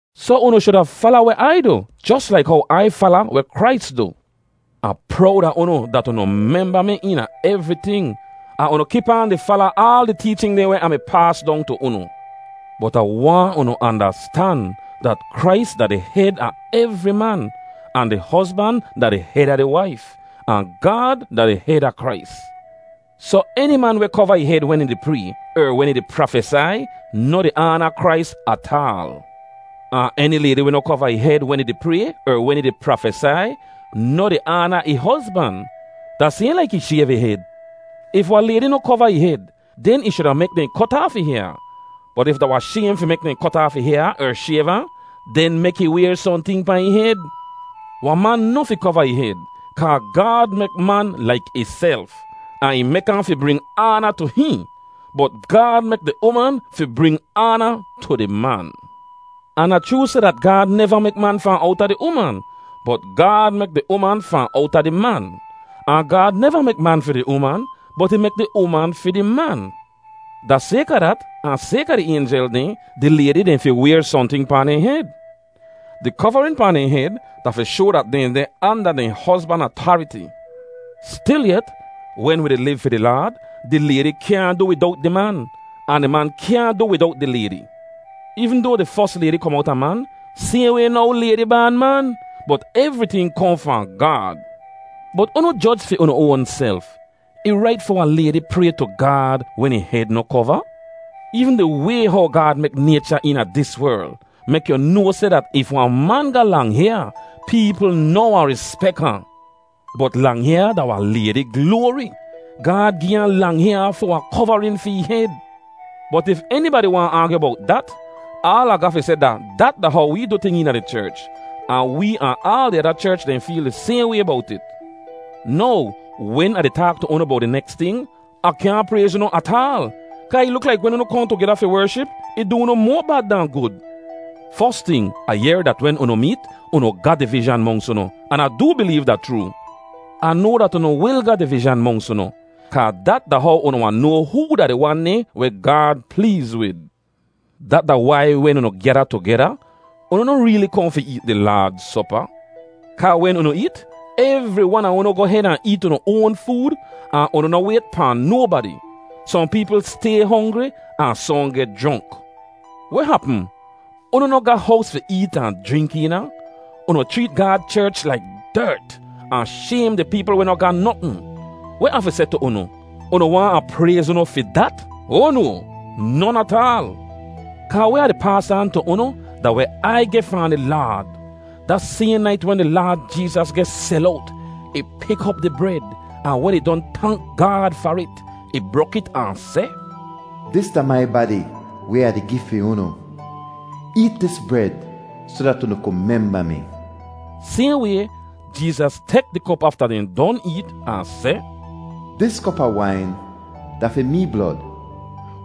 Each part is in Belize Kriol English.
Soh unu shuda fala weh Ai du jos laik how Ai fala weh Krais du. Ah prowd a unu dat unu memba mi eena evriting, ahn unu kip aan di fala aal di teechin dehn weh Ah mi paas dong tu unu. Bot Ah waahn unu andastan dat Krais da di hed a evri man, ahn di hozban da di hed a di waif, ahn Gaad da di hed a Krais. Soh eni man weh kova ih hed wen ih di pray er wen ih di prafesai, noh di aana Krais ataal. Ahn eni laydi weh noh kova ih hed wen ih di pray er wen ih di prafesai, noh di aana ih hozban. Da sayhn laik ih shayv ih hed. If wahn laydi noh kova ih hed, den ih shuda mek dehn kot aaf ih hyaa; bot if da wahn shaym fi mek dehn kot aaf ih hyaa er shayv ahn, den mek ih wayr sohnting pahn ih hed. Wahn man noh fi kova ih hed, kaa Gaad mek man laik ihself, ahn ih mek ahn fi bring aana tu hihn. Bot Gaad mek di uman fi bring aana tu di man. Ahn da chroo seh dat Gaad neva mek man fahn owta di uman, bot Gaad mek di uman fahn owta di man. Ahn Gaad neva mek man fi di uman, bot ih mek di uman fi di man. Da sayka dat, ahn sayka di aynjel dehn, di laydi dehn fi wayr sohnting pahn dehn hed. Di kovarin pahn dehn hed da fi shoa dat dehn deh anda dehn hozban atariti. Stilyet, wen wi di liv fi di Laad, di laydi kyaahn du widowt di man, ahn di man kyaahn du widowt di laydi. Eevn doa di fos laydi kom owta man, sayhn way now laydi baan man. Bot evriting kohn fahn Gaad. Bot unu joj fi unu oanself—ih rait fi wahn laydi pray tu Gaad wen ih hed noh kova? Eevn di way how Gaad mek naycha eena dis werl, mek yu noa seh dat if wahn man ga lang hyaa peepl noh wahn rispek ahn. Bot lang hyaa da wahn laydi gloari. Gaad gi ahn lang hyaa fi wahn kovarin fi ih hed. Bot if enibadi waahn aagyu bowt dat, aal Ah ga fi seh da dat da how wee du ting eena di cherch, ahn wee ahn aal di ada cherch dehn feel di sayhn way bowt it. Now, wen Ah di taak tu unu bowt di neks ting, Ah kyaahn prayz unu ataal. Kaa ih luk laik wen unu kohn tugeda fi wership, ih du unu moa bad dahn gud. Fos ting, Ah yehr dat wen unu meet, unu ga divizhan monks unu, an Ah doo bileev da chroo. Ah noa dat unu wil ga divizhan monks unu, kaa dat da how unu wahn noa hoo da di wan dehn weh Gaad pleez wid. Dat da wai wen unu gyada tugeda, unu noh reeli kohn fi eet di Laad sopa. Kaa wen unu eet, evri wan a unu goh hed ahn eet unu oan food ahn unu noh wayt pahn nobadi. Sohn peepl stay hongri ahn sohn geh jronk. Weh hapm? Unu noh ga hows fi eet ahn jrink eena? Unu chreet Gaad cherch laik dert, ahn shaym di peepl weh noh ga notn. Weh Ah fi seh tu unu? Unu waahn Ah prayz unu fi dat? Oa no! Non ataal! Kaa weh Ah di paas aan tu unu da weh Ai geh fahn di Laad. Da sayhn nait wen di Laad Jeezas geh sel owt, ih pik op di bred, ahn wen ih don tank Gaad far it, ih brok it ahn seh, “Dis da mai badi weh Ah di gi fi unu; eet dis bred soh dat unu ku memba mi.” Sayhn way, Jeezas tek di kop afta dehn don eet, ahn seh, “Dis kop a wain da fi mee blod,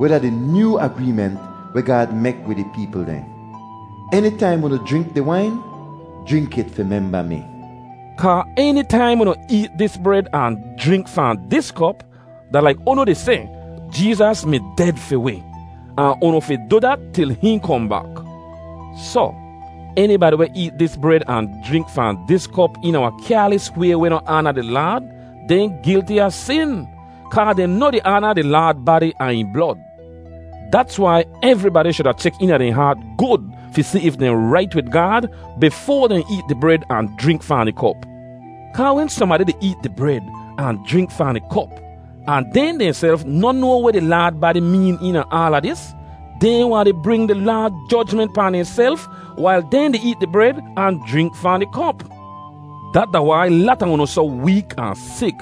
weh da di nyoo agreement weh Gaad mek wid ih peepl dehn. Enitaim unu jrink di wain, jrink it fi memba mi.” Kaa enitaim unu eet dis bred ahn jrink fahn dis kop, da laik unu di seh, “Jeezas mi ded fi wi.” Ahn unu fi du dat til hihn kohn bak. Soh, enibadi weh eet dis bred ahn jrink fahn dis kop eena wahn kyaalis way weh noh aana di Laad, dehn gilti a sin, kaa dehn noh di aana di Laad badi ahn ih blod. Dats wai evribadi shuda chek eena dehn haat gud fi si if dehn rait wid Gaad bifoa dehn eet di bred ahn jrink fahn di kop. Kaa wen sohnbadi di eet di bred ahn jrink fahn di kop, ahn dehn dehnself noh noa weh di Laad badi meen eena aala dis, dehn wahn di bring di Laad jojment pahn dehnself wail dehn di eet di bred ahn jrink fahn di kop. Dat da wai lata unu soh week ahn sik,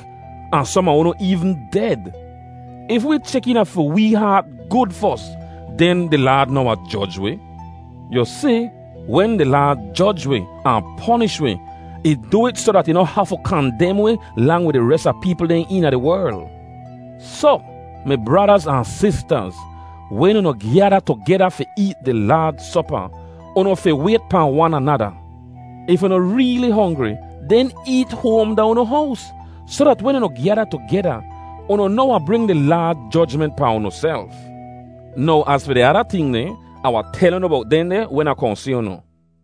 ahn som a unu eevn ded! If wee chek eena fi wee haat gud fos, den di Laad noh wahn joj wi. Yu si, wen di Laad joj wi, ahn ponish wi, ih du it soh dat ih noh hafu kandem wi lang wid di res a peepl dehn eena di werl. Soh, mi bradaz ahn sistaz, wen unu gyada tugeda fi eet di Laad Sopa, unu fi wayt pahn wan anada. If unu reeli hongri, den eet hoam da unu hows, soh dat wen unu gyada tugeda, unu noh wahn bring di Laad jojment pahn unuself. Now az fi di ada ting dehn, Ah wahn tel unu bowt dehndeh wen Ah kohn si unu.